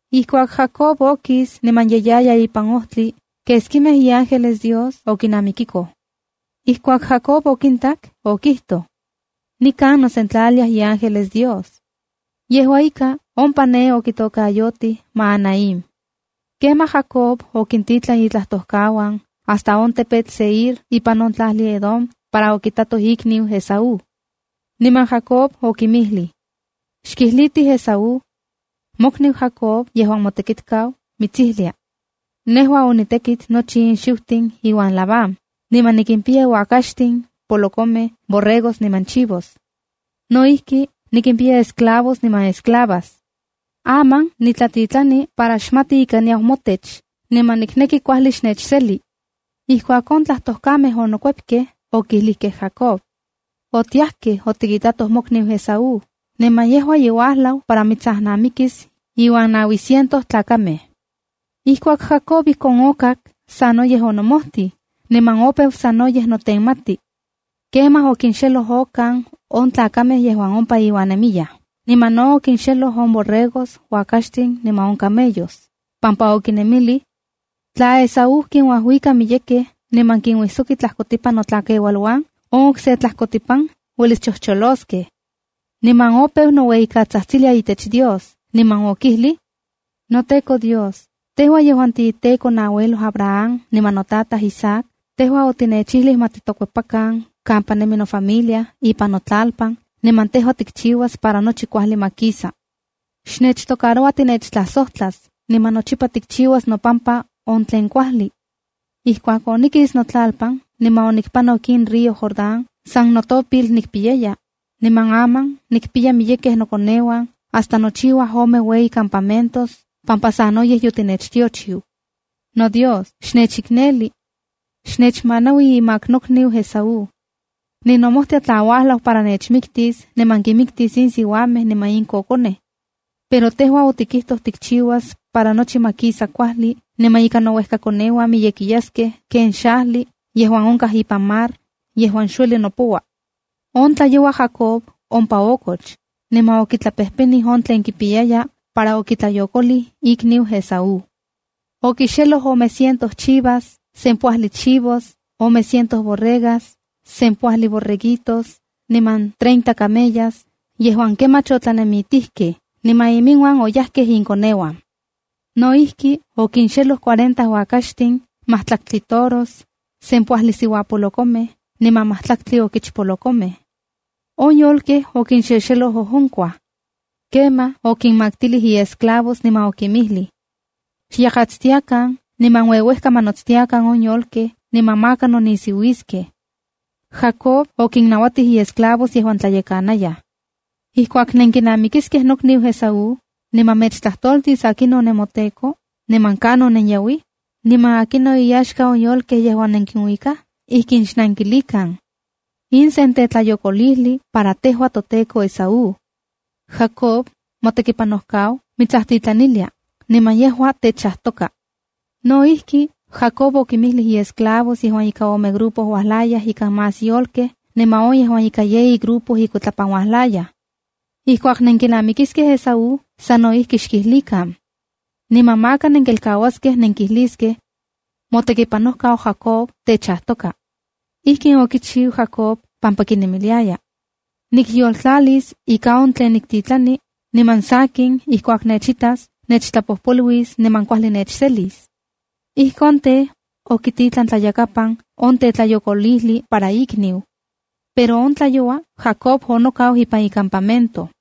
Ijkuak Jacob okis niman ye yaya ipan ojtli, keskimej iángeles Dios okinamikikoj. Ijkuak Jacob okintak, okijtoj: “Nikan nosentlaliaj iángeles Dios.” Yejua ika, ompa ne okitokayotij Mahanaima. Kemaj Jacob okintitlan itlajtojkauan hasta on tepetl Seir ipan on tlajli Edom para okitatoj ikniu Esaú. Niman Jacob okinmijlij: “Xkijlitij Esaú: ‘Mokniu Jacob yejuan motekitkau mitsijlia: Nejua onitekit nochi in xiutin iuan Labán, niman nikimpiya uakaxtin, polokomej, borregos niman chivos. No ijki, nikimpiya esclavos niman esclavas. Aman nitlatitlani para xmati ika niyau motech, niman nikneki kuajli xnechseli.’” Ijkuak on tlajtojkamej onokuepkej, okilijkej Jacob: —Otiajkej otikitatoj mokniu Esaú, niman yejua ye uajlau para mitsajnamikis iuan naui ciento tlakamej. Ijkuak Jacob ijkon okak, sanoyej onomojtij, niman opeu sanoyej notenmati. Kemaj okintlajkoxeloj okan on tlakamej yejuan ompa iuan nemiyaj. Niman no okintlajkixeloj on borregos, uakaxtin niman camellos, pampa okinemilij: “Tla Esaú kinuajuika miyekej niman kinuijsoki tlajkotipan notlakeualuan, on okse tlajkotipan uelis chojcholoskej.” Niman opeu noueyikatsajtsilia itech Dios, niman okijlij: “NoTEKO Dios, tejua yejuan tiiTEKO noauelo Abraham niman notataj Isaac, tejua otinechijli ma titokuepakan kampa nemi nofamilia, ipan notlalpan niman tejua tikchiuas para nochi kuajli ma kisa. Xnechtocaroua tinechtlajsojtlas, niman nochipa tikchiuas nopampa on tlen kuajli. Ijkuak onikis notlalpan niman onipanok in río Jordán, san notopil nikpiyaya, niman aman nikimpiya miyekej nokoneuan hasta nochiuaj ome ueyi camamentos pampa sanoyej yotinechtiochiu. NoDios, xnechikneli. Xnechmanaui imak nokniu Esaú. Ninomojtia tla uajlau para nechmiktis niman kinmiktis in siuamej niman in kokonej. Pero tejua otikijtoj tikchiuas para nochi ma kisa kuajli, niman ika nouejkakoneuan miyekiyaskej ken on xajli yejuan onkaj ipan on mar yejuan xueli nopoua.” On tlayoua Jacob ompa okoch, niman okitlapejpenij on tlen kipiyaya para okitlayokolij ikniu Esaú. Okixeloj ome cientos chivas, sempoajli chivos, ome cientos borregas, sempoajli borreguitos, niman treinta camellas yejuan kemach otlanemitijkej, niman oyajkej inmiuan inkoneuan. No ijki, okinxeloj cuarenta uakaxtin, matlaktli toros, sempoajli siuapolokomej niman matlaktli okichpolokomej. On yolkej okinxexeloj ojonkuaj. Kemaj, okinmaktilij iesclavos niman okinmijlij: —Xyakatstiakan niman ueuejka ma notstiakan on yolkej, niman maka nonisiuiskej. Jacob okinnauatij iesclavos yejuan tlayekanayaj: —Ijkuak nenkinamikiskej nokniu Esaú, niman mechtlajtoltis akinon nemoteko, niman kanon nenyauij, niman akinon iyaxka on yolkej yejuan nenkinuikaj, ijkin xnankilikan: “In sen tetlayokolijli para tejua toteko Esaú. Jacob, motekipanojkau mitsajtitlanilia, niman yejua techajtoka.” No ijki, Jacob okinmijlij iesclavos yejuan ika ome grupo uajlayaj ikan más yolkej niman on yejuan ika yeyi grupo inkuitlapan uajlayaj: —Ijkuak nenkinamikiskej Esaú, sa no ijki xkijlikan. Niman maka nenkelkauaskej nenkijliskej: “Motekipanojkau Jacob techajtoka.” Ijkon okichiu Jacob pampa kuinemiliaya: “Nikyoltlalis ika on tlen niktitlani, niman sakin ijkuak nechitas, nechtlapojpoluis niman kuajli nechselis.” Ijkon tej, okititlan tlayakapan on tetlayokolijli para ikniu. Pero on tlayoua Jacob onokau ipan icampamento.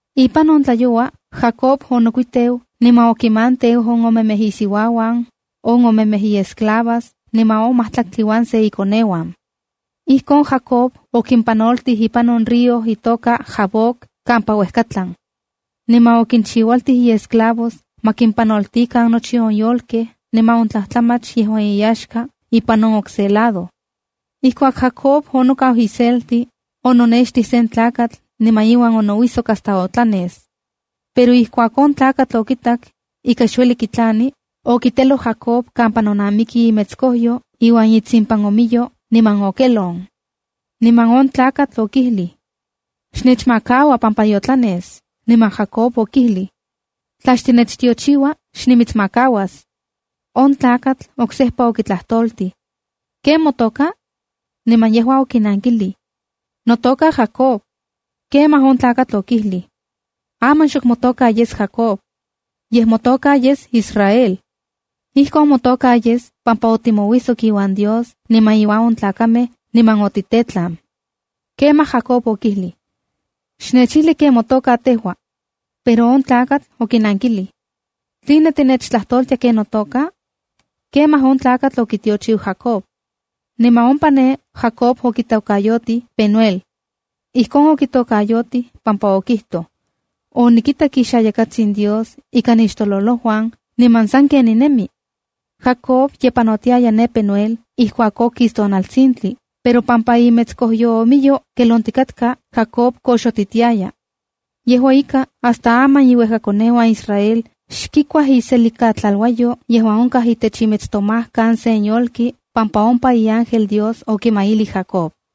Ipan on tlayoua Jacob onokuiteu niman okinmanteu on omemej isiuauan, on omemej iesclavas, niman on majtlaktli uan se ikoneuan. Ijkon Jacob okimpanoltij ipan on río itoka Jaboc kampa xuejkatlan. Niman okinchiualtij iesclavos ma kimpanoltikan nochi on yolkej niman on tlajtlamach yejuan iyaxka ipan on okse lado. Ijkuak Jacob onokau iselti, ononextij se tlakatl niman iuan onouijsok hasta otlanes. Pero ijkuak on tlakatl okitak, ika xueli kitlani, okiteloj Jacob kampa nonamiki imetskojyo iuan itsimpanomiyo niman okelon. Niman on tlakatl okijlij: —Xnechmakaua pampa yotlanes. Niman Jacob okijlij: —Tla xtinechtiochiua, xnimitsmakauas. On tlakatl oksejpa okitlajtoltij: —¿Ken motoka? Niman yejua okinankilij: —Notoka Jacobb. Kemaj on tlakatl okijlij: —Aman xok motoka yes Jacob. Yej motoka yes Israelc. Ijkon motoka yes pampa otimouijsok iuan Dios niman iuan on tlakamej niman otitetlan. Kemaj Jacob okijlij: —Xnechijli ken motoka tejua. Pero on tlakatl okinankilij: —¿Tline tinechtlajtoltia ken notoka? Kemaj on tlakatl okitiochiu Jacob. Niman ompa ne, Jacob okitokayotij Penueld. Ijkon okitokayotij pampa okijtoj: “Onikitak ixayakatsin Dios ikan nixtololojuan, niman sanken ninemi.” Jacob ye panotiaya ne Penuel ijkuak okis tonaltsintli, pero pampa imetskojyoomiyo kelonkikatka, Jacob koxotitiaya. Yejua ika, hasta aman iuejkakoneuan Israel xkikuaj iselikatlaluayo yejuan onkaj itech imetstomajkan sen yolki pampa ompa iángel Dios okimailij Jacob.